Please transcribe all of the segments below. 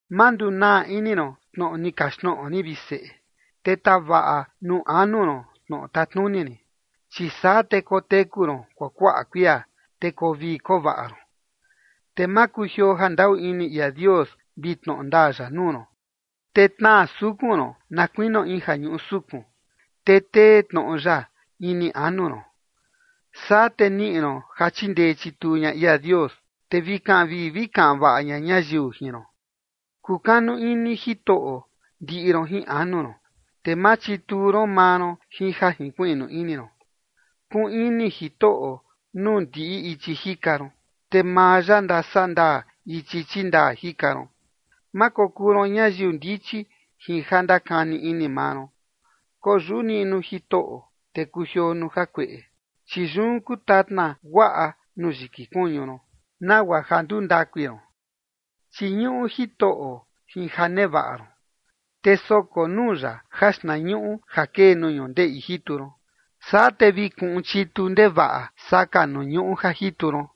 Ma ndunaa ini ron tnoꞌo ni kaxtnoꞌo rin, vi seꞌe, te tavaꞌa nuu anu ron tnoꞌo tatnuni rin. Chi saa, te koteku ron kuakuaꞌa kuia, te koo vii koo vaꞌa ron. Te ma kujioo jandaꞌu ini ia Dios vi tnoꞌo ndaa ya nuu ron, te tnaa sukun ron na kuinio in ja ñuꞌu sukun, te tee tnoꞌo ya ini anu ron. Saa te niꞌi ron ja chindee chituu ña ia Dios, te vi kaꞌan vii vi kaꞌan vaꞌa ña ñayiu jin ron. Kukanu ini Jitoꞌo ndiꞌi ron jin anu ron, te ma chituu ron maa ron jin ja jinkuiꞌnu ini ron. Kuꞌun ini Jitoꞌo nuu ndiꞌi ichi jika ron, te maa ya ndasandaa ichi chindaa jika ron. Ma kokuu ron ñayiu ndichi jin ja ndakani ini maa ron, koyuꞌu niꞌnu Jitoꞌo, te kujioo nuu jakueꞌe. Chi yun kuu tatna guaꞌa nuu yiki kuñu ron, nagua ja nduu ndakui ron. Chiñuꞌu Jitoꞌo jin ja nevaꞌa ron, te soko nuu ya jaxtnañuꞌu ja kee nuu ñundeꞌi jitu ron. Saa te vi kuꞌun chitu ndevaꞌa saka nuu ñuꞌu ja jitu ron,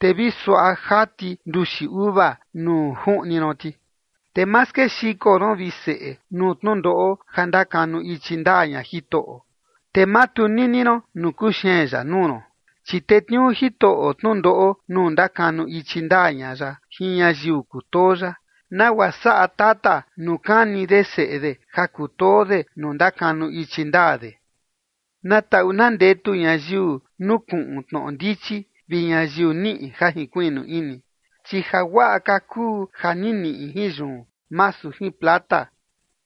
te vi suaꞌa jati nduxi uva nuu juꞌni ron ti. Te ma skexiko ron, vi seꞌe, nuu tnundoꞌo ja ndakanu ichi ndaa ña Jitoꞌo, te ma tunini ron nuu kuxeen ya nuu ron. Chi tetniuu Jitoꞌo tnundoꞌo nuu ndakanu ichi ndaa ña ya jin ñayiu kutoo ya, nagua saꞌa tata nuu kani de seꞌe de ja kutoo de nuu ndakanu ichi ndaa de. Na taꞌu na ndetu ñayiu nukuꞌun tnoꞌo ndichi vi ñayiu niꞌi ja jinkuiꞌnu ini. Chi jaguaꞌa ka kuu ja ni niꞌi jin yun, masu jin plata,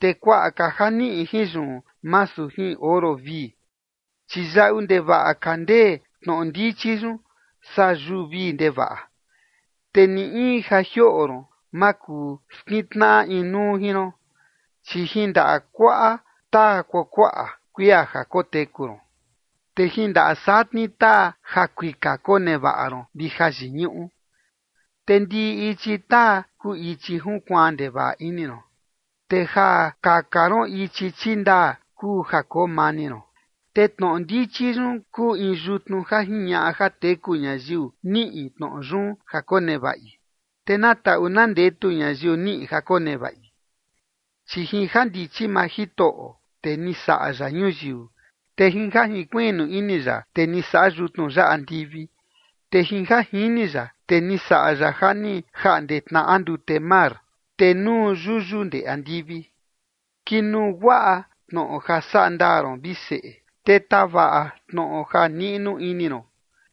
te kuaꞌa ka ja niꞌi jin yun, masu jin oro vii. Chi yaꞌu ndevaꞌa ka ndee tnoꞌo ndichi yun saa yuu vii ndevaꞌa, te ni in ja jioꞌo ron ma kuu skintnaꞌa inuu jin ron. Chi jin ndaꞌa kuaꞌa taa kuakuaꞌa kuia ja koteku ron, te jin ndaꞌa satni taa jakuika konevaꞌa ron vi jayiñuꞌu. Te ndiꞌi ichi taa kuu ichi junkuaan ndevaꞌa ini ron. Te ja kaka ron ichi chindaa kuu ja koo mani ron. Te tnoꞌo ndichi yun kuu in yutnu ja jiñaꞌa ja teku ñayiu niꞌi tnoꞌo yun ja konevaꞌi, te na taꞌu na ndetu ñayiu niꞌi ja konevaꞌi. Chi jin jandichi maa Jitoꞌo, te ni saꞌa ya ñuyiu. Te jin ja jinkuiꞌnu ini ya, te ni saꞌa yutnu ya andivi. Te jin ja jini ya, te ni saꞌa ya ja ni jaꞌnde tnaꞌa ndute mar, te nuu yuyu ndee andivi. Kinuu guaꞌa tnoꞌo ja saꞌa ndaa ron, vi seꞌe, te tavaꞌa tnoꞌo ja niꞌnu ini ron.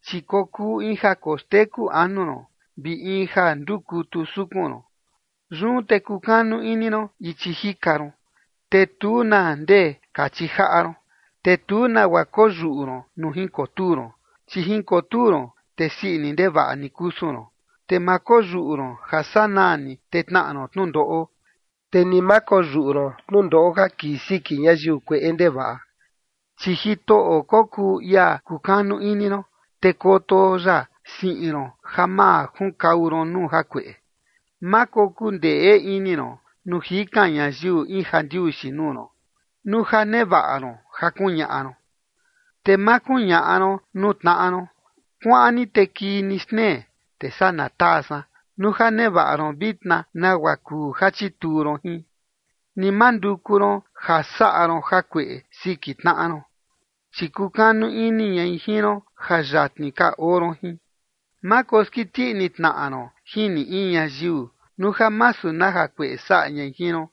Chi kokuu in ja koxteku anu ron, vi in ja ndukutu sukun ron. Yun te kukanu ini ron ichi jika ron, te tu na ndee kachi jaꞌa ron. Te tu nagua koyuꞌu ron nuu jinkotuu ron, chi jinkotuu ron, te sii ini ndevaꞌa ni kusun ron. Te ma koyuꞌu ron ja sanaa ni, te tnaꞌa ron tnundoꞌo, chi ni ma koyuꞌu ron tnundoꞌo ja kii siki ñayiu kueꞌe ndevaꞌa. Chi Jitoꞌo kokuu ia kukanu ini ron, te koto ya siꞌin ron ja ma junkau ron nuu jakueꞌe. Ma kokuu ndeꞌe ini ron, nuu jikan ñayiu in jandiuxi nuu ron, nuu ja nevaꞌa ron ja kuñaꞌa ron. Te ma kuñaꞌa ron nuu tnaꞌa ron: “Kuaꞌan ni te kii ni xtnee, te saa na taa san” nuu ja nevaꞌa ron vitna nagua kuu ja chituu ron jin. Ni ma nduku ron ja saꞌa ron jakueꞌe siki tnaꞌa ron chi kukanu ini ñai jin ron ja yatni ka oo ron jin. Ma koskiti ini tnaꞌa ron jin ni in ñayiu, nuu ja masu na jakueꞌe saꞌa ñai jin ron.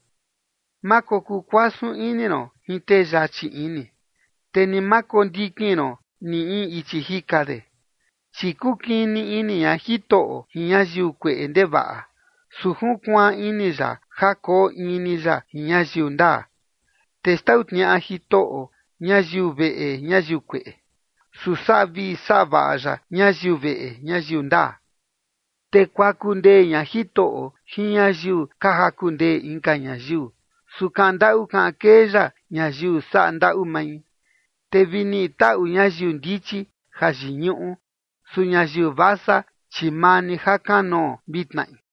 Ma kokuu kuasun ini ron jin tee yachi ini, te ni ma kondikin ron ni in ichi jika de. Chi kukini ini ña Jitoꞌo jin ñayiu kueꞌe ndevaꞌa, su junkuaan ini ya ja koo in ni ya jin ñayiu ndaa. Te xtau tniaꞌa Jitoꞌo ñayiu veꞌe ñayiu kueꞌe, su saꞌa vii saꞌa vaꞌa ya ñayiu veꞌe ñayiu ndaa. Te kuaku ndee ña Jitoꞌo jin ñayiu ka jaku ndee inka ñayiu, su kaꞌan ndaꞌu kaꞌan kee ya ñayiu saꞌa ndaꞌu mai. Te vi niꞌi taꞌu ñayiu ndichi jayiñuꞌu, su ñayiu vasa, chi maa ni jakanoo vi tnaꞌi.